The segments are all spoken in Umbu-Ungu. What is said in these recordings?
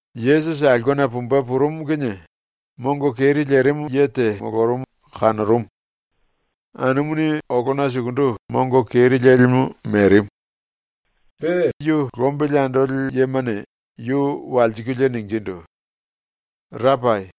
Yesusi aulkena pumbe purumu kinie mongo keri lerimu ye te molorumu kanorumu. Anumuni olona sukundu mongo keri lelimu merimu. Pe yu lombili andoli yemane yu walsikulie ningindu: “Rapai,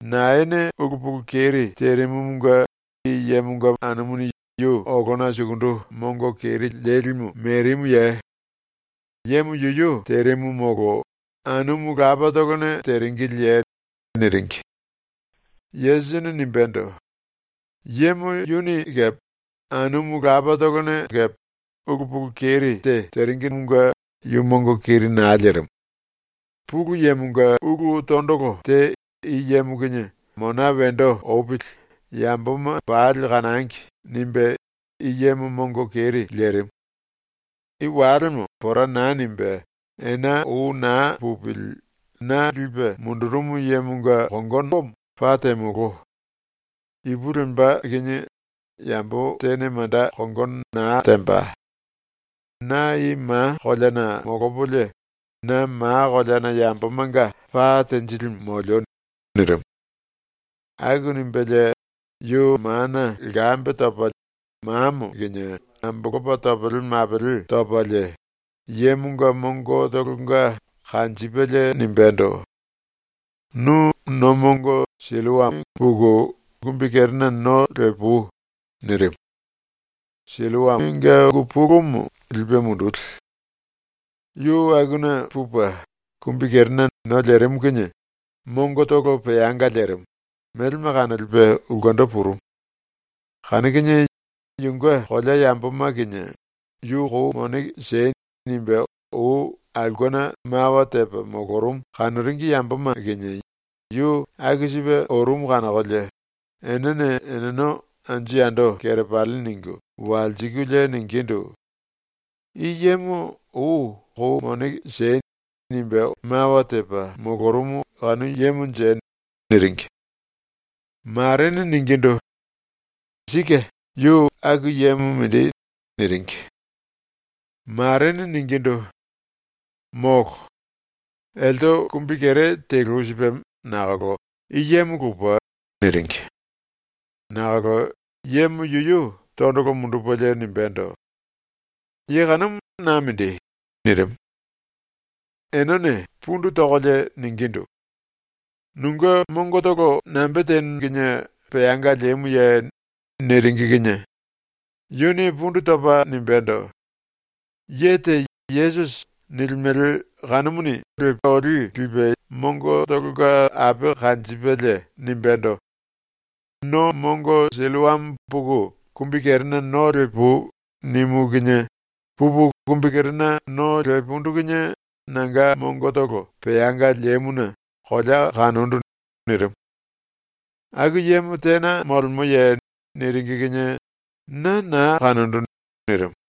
naene ulu pulu keri terimumunge i yemonga anumuni yu olona sukundu mongo keri lelimu merimuye? Yemo yuyu terimu molo anumu lapatolone teringiliye?” niringi. Yesusini nimbendo: “Yemo yuni kepe anumu lapatolone kepe ulu pulu keri te teringine yu mongo keri naa lerimu. ‘Pulu Yemonga ulu tondolo te i yemo kinie mona wendo opili yamboma pali kanangi.’ nimbe i yemo mongo keri lerimu. I walemo pora naa nimbe ena ou naa pupili na lipe mundurumu yemonga kongono paa temolo. Ipu lemba kinie yambo tene manda kongono naa temba. Na i ma koleana molopolie, na ma koleana yambomanga pa tenjilimu molio.” nirimu. Aku nimbelie yu mana lkambe topalie mamo kinie ambolopa topele mapele topalie yemonga mongotolonga kanjipelie nimbendo: “Nu no mongo Silloamo puku kumbikerena no lepui.” nirimu. (Silloamonga ungu pulumu ‘lipe munduli’.) Yu akuna pupe kumbikerena no lerimu kinie mongotolo peanga lerimu, melema kanolipe ulkendo purumu. Kanu kinie yunge kolea yamboma kinie “Yu kou mone siei.” nimbe ou aulkena mawa tepa molorumu kanoringi yamboma kinie yu aku sipe orumu kanokolie enene eneno anju yando kerepali ningu walsikulie ningindu: “I yemo ou “Kou mone siei.” nimbe mawa tepa molorumu kanu yemonje?” niringi. Marene ningindu: “Sike, yu aku yemo mindi.” niringi. Marene ningindu: “Molo. Elte kumbikere telu sipe nakolo i yemo lupe.” niringi. Nakolo yemo yuyu tondolo mundupelie nimbendo: “Ye kanumu na mindi.” nirimu. Enene pundu tokolie ningindu: “Nunge mongotolo nambe tenu kinie peanga lemuye?” niringi kinie yuni pundu topa nimbendo: “Ye te ‘Yesusi’ nilimele kanumuni olí lipe mongotolonga ape kanjipelie nimbendo: “No mongo Silloamo puku kumbikerena no lepui.” nimu kinie pupu kumbikerena no lepundu kinie nanga mongotolo peanga lemuna kolea kanondu.” nirimu. “Aku yemo tena molemoye?” niringi kinie “Na naa kanondu.” nirimu.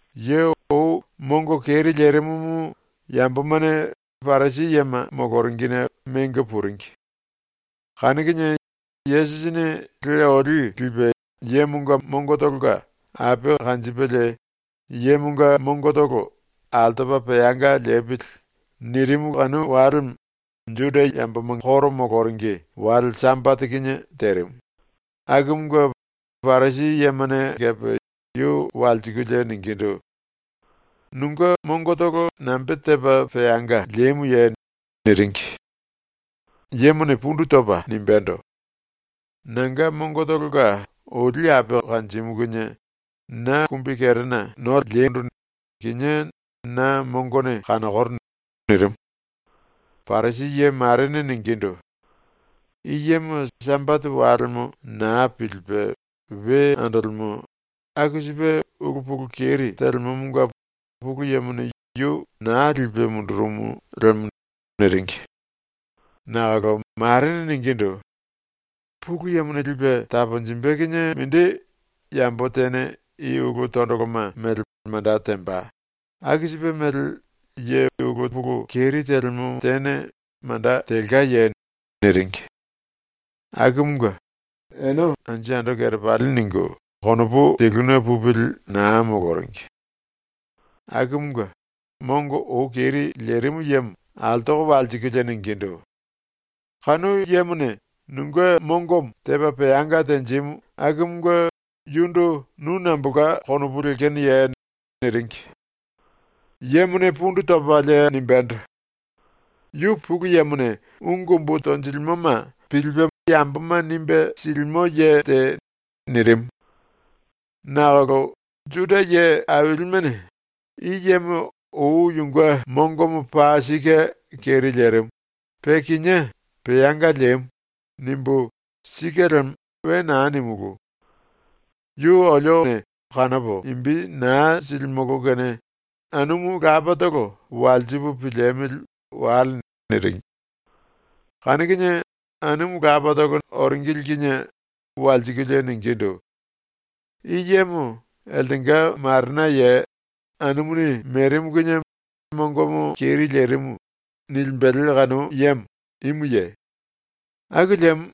Ye ou mongo keri lerimumu yambomane Parisi yema moloringine mengo puringi. Kanu kinie, Yesusini le olí lipe yemonga mongotolonga ape kanjipelie yemonga mongotolo ‘altopa peanga lepili.’ nirimu kanu walemo ⸤Juda yamboma koro moloringi⸥ wale Sambate kinie terimu, akumunge Parisi yemane kepe yu walsikulie ningindu: “Nunge mongotolo nambe tepa peanga lemuye?” niringi. Yemone pundu topa nimbendo: “Nanga mongotolonga oli ape kanjimu kinie na kumbikerena no lepolie kinie na mongone kanokoro.” nirimu. Parisi ye marene ningindu: “I yemo Sambate walemo naa pilipe we andolemo, aku sipe ulu pulu keri telemomonga Pulu Yemone yu naa lipe mundurumu lemo.” niringi. Nakolo marene ningindu: “Pulu Yemone lipe taponjimbe kinie mindi yambo tene i ulu tondoloma mele manda temba aku sipe mele ye ulu pulu keri telemo tene manda telkaye?” niringi. Akumunge ene anju yando kerepali ningu konopu teluna pupili naa moloringi. Akumunge mongo ou keri lerimu yemo altoko walsikulie ningindu: “Kanu yemone nunge mongomo tepa peanga tenjimu akumunge yundu nu nambolka konopu lekenoye?” niringi. Yemone pundu topalie nimbendo: “Yu Pulu Yemone ungu umbu tonjilimoma pilipe yamboma nimbe silimo ye te.” nirimu. Nakolo Juda ye ailimene “‘I yemo ou yunge mongomo paa sike keri lerimu, pe kinié peanga lemu.’ nimbu ‘sike lemo.’ we naa nimulú. Yu olio kanopo imbi naa silimolo kene anumu lapatolo walsipu piliemili wale.” niringi. Kanu kinie anumu lapatolo oringili kinie walsikulie ningindu: “I yemo eltenga marenaye? “Anumuni merimu kinie mongomo keri lerimu.” nilimbele kanu yemo imuye? Aku liemo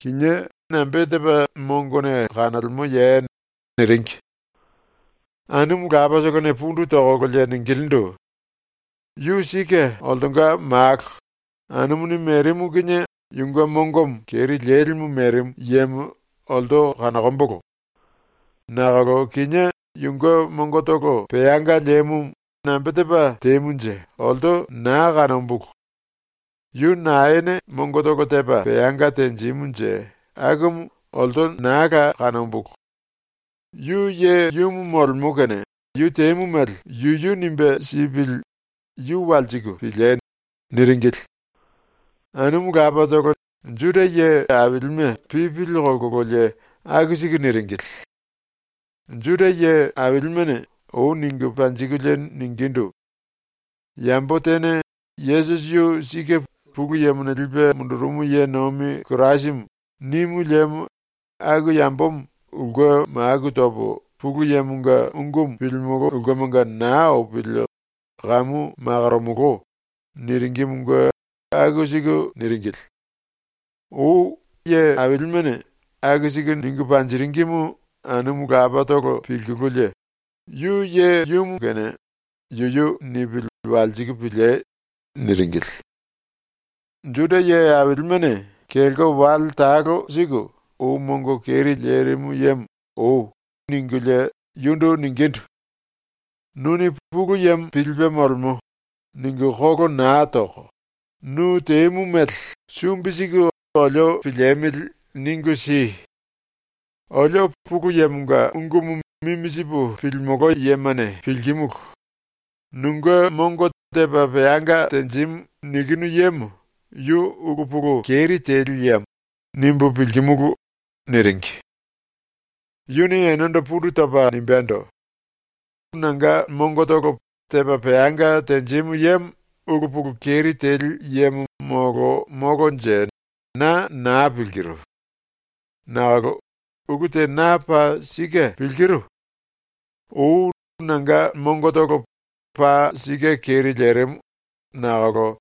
kinié nambe tepa mongone kanolemoye?” niringi. Anumu lapatolone pundu tokolo ningilindu: “Yu sike oltonga malo, anumuni merimu kinie yunge mongomo keri lelimu merimu yemo olto kanokombolo. Nakolo kinie yunge mongotolo peanga lemumu nambe tepa temunje olto naa kanombulu. Yu naene mongotolo tepa peanga tenjimunje akumu olto naa la kanombulu. Yu yemo molemo kene yu temu mele yuyu nimbe sipili yu walsiku piliei.” niringili. Anumu lapatolo Juda ye ailime pipili kolkololie aku siku niringili. Juda ye ailimene ou ningu panjikulie ningindu: “Yambo tene ‘Yesusi yu sike Pulu Yemone lipe mundurumu ye nomi Kirasimu.’ nimu liemo aku yambomo ulke maku topo Pulu Yemonga ungumu pilimolo ulkemanga naa opili kamu makoromolo.” niringimunge aku siku niringili. Ou ye ailimene aku siku ningu panjiringimu anumu lapatolo pilkululie “Yu yemo kene yuyu nipili walsiku piliei.” niringili. Juda ye ailimene kelko talo siku ou mongo keri lerimu yemo “Oi.” ningulie yundu ningindu: “Nuni ‘Pulu Yemo pilipe molemo.’ ningu kolo naa toko, nu temu mele sumbi siku olio piliemili ningu si! ⸤Olio Pulu Yemonga ungumu mimi sipu pilimolo yemane pilkimulu,⸥ ‘ ‘Nunge mongo tepa peanga tenjimu.’ nikinu yemo yu ulu pulu keri teli yemo.’ nimbu pilkimulu.” niringi. Yuni enendo pundu topa nimbendo: “Na mongo tepa peanga tenjimu yemo ulu pulu keri teli yemo molo molonje, na naa pilkiru. Nakolo ulu te na paa sike pilkiru. Ou nanga mongotolo paa sike keri lerimu nakolo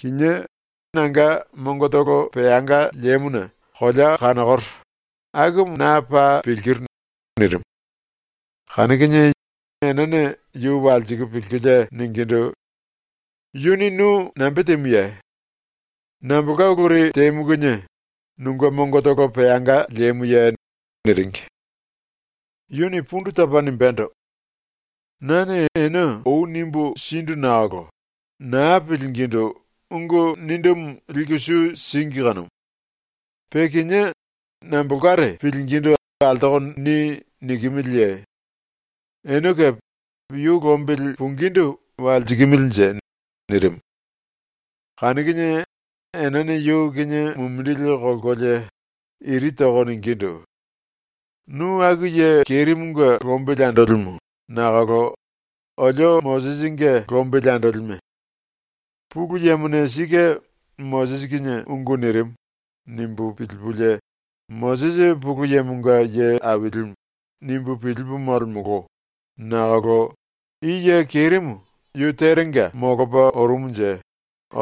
kinie nanga mongotolo peanga lemuna kolea kanokoro, akumu na paa pilkiru.” nirimu. Kanu kinie enene yu walsiku pilkulie ningindu: “Yuni nu nambe temuye? Nambolka uluri temu kinie nunge mongotolo peanga lemuye?” niringi. Yuni pundu topa nimbendo: “Nane ene ou nimbu sindu nakolo naa pilingindu ungu nindumu liku su síngi kanumu. Pe kinié nambolkare pilingindu altoko ‘ni!’ nikimiliye? Ene kepe yu lombili pungindu walsikimilinje?” nirimu. Kanu kinie enene yu kinie mumindili kolkolie iri toko ningindu: “Nu aku ye kerimunge lombili andolimu nakolo olio Mosisinge lombili andolime. ‘Pulu Yemone sike Mosisi kinie ungu nirimu.’ nimbu pilipulie ⸤‘Mosisi Pulu Yemonga ye ailimu.’ nimbu pilipu molemolo⸥ nakolo i ye kerimu yu terenga molopa orumunje,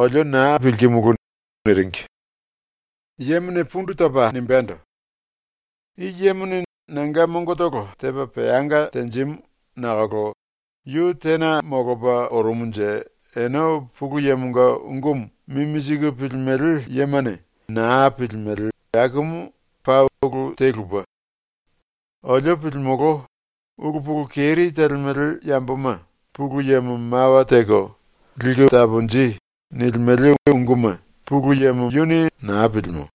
olio naa pilkimulu.” niringi. Yemone pundu topa nimbendo: “I yemone nanga mongotolo tepa peanga tenjimu nakolo yu tena molopa orumunje ene Pulu Yemonga ungumu mimi siku pilimele yemane naa pilimele akumu paa ulu te lupe. Olio pilimolo, ‘Ulu pulu keri telemele yamboma Pulu Yemo mawa teko “Liku taponji.” nilimele unguma naa pilimo.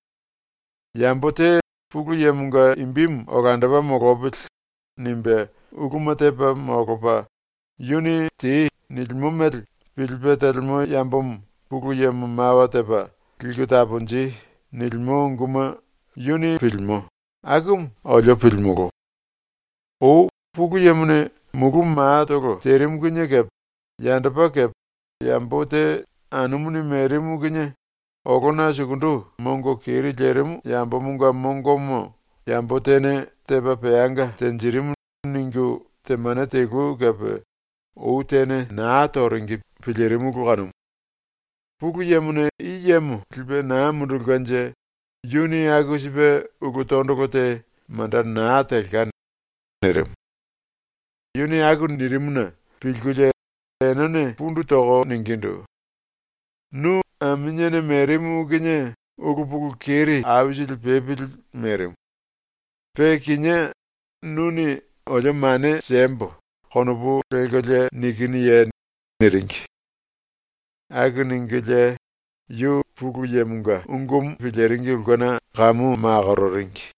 Yambo te ‘Pulu Yemonga imbimu olandopa molopili.’ nimbe uluma tepa molopa, yuni “Tei.” nilimo mele pilipe telemo yambomo Pulu Yemo mawa tepa “Liku taponji.” nilimo unguma pilimo.’ akumu olio pilimolo. Ou Pulu Yemone mulu matolo terimu kinie kepe yandopa kepe yambo te anumuni merimu kinie olona sukundu mongo keri lerimu yambomonga mongomo yambo tene tepa peanga tenjirimu ningu temane telu kepe ou tene naa toringi pilirimulu kanumu. Pulu Yemone i yemo lipe naa mundulkenje yuni aku sipe ulu tondolo te manda naa telka.” nirimu. Yuni aku nirimuna pilkulie enene pundu toko ningindu: “Nu aminiene merimu kinie ulu pulu keri aisili pepili merimu. Pe kinié nuni ‘olio mane siembo.’ konopu lelkolie nikinuye?” niringi. Aku ningulie yu ⸤Pulu Yemonga ungumu piliringi ulkena kamu⸥ makororingi.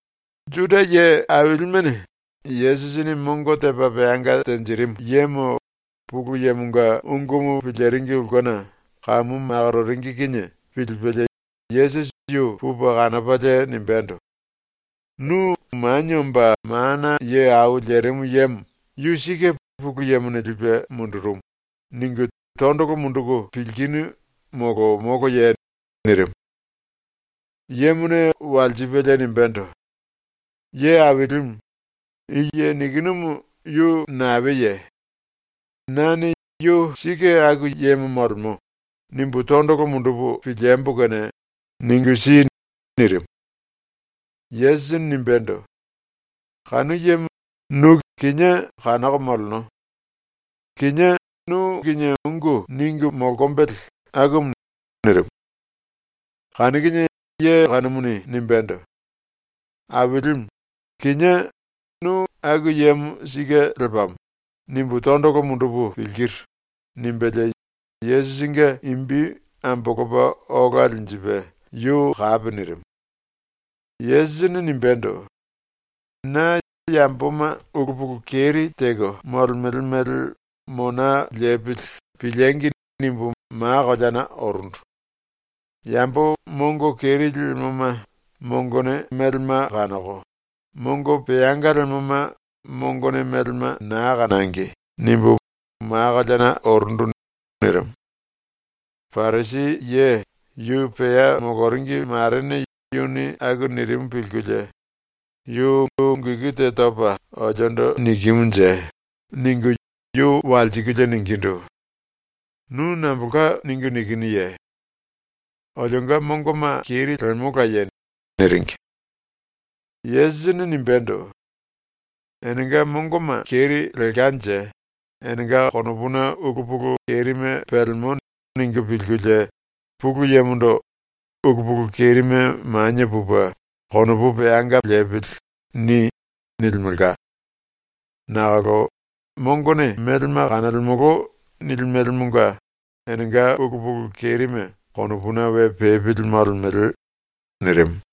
Juda ye ailimene Yesusini mongo tepa peanga tenjirimu yemo ⸤Pulu Yemonga ungumu piliringi ulkena⸥ kamu makororingi kinie pilipelie Yesusi yu pupe kanopalie nimbendo: “Nu Manie Omba Mana Ye Au Lerimu Yemo ⸤‘Yu sike Pulu Yemone lipe mundurumu⸥.’ ningu tondolo munduku pilkinu molo moloye?” nirimu. Yemone walsipelie nimbendo: “Ye Ailimu, i ye nikinumu yu naeye? Nane ‘yu sike aku yemo molemo.’ nimbu tondolo mundupu piliembo kene ningu si.” nirimu. Yesusini nimbendo: “Kanu yemo nu kinie kanoko moleno. Kinié nu kinie ungu ningu molkombele akumu.” nirimu. Kanu kinie ye kanumuni nimbendo: “Ailimu, kinié ‘Nu aku yemo sike lepamo.’ nimbu tondolo mundupu pilkiru.” nimbelie Yesusinge imbi ambolopa ola linjipe yu kapi nirimu. Yesusini nimbendo: “Na ‘yamboma ulu pulu keri teko molemele mele mona lepili piliengi!’ nimbu ma koleana orundu. ‘Yambo mongo keri lemoma mongone melema kanoko, mongo peanga lemoma mongone melema naa kanangi.’ nimbu ma koleana orundu.” nirimu. Parisi ye yu pea moloringi marene yuni aku nirimu pilkulie ‘Yu ungu iku te topa oliondo nikimunje?’ ningu yu walsikulie ningindu: “Nu nambolka ningu nikinuye? Olionga mongoma keri lemolaye?” niringi. Yesusini nimbendo: “Enenga mongoma keri lelkanje enenga ‘konopuna ulu pulu kerime pelemo.’ ningu pilkulie, ⸤Pulu Yemondo⸥ “‘Ulu pulu kerime manie pupe konopu peanga lepili.’ ni.” nilimelka. Nakolo “Mongone melema kanolemolo.” nilimelemonga enenga ulu pulu kerime konopuna we pepili molemele.” nirimu.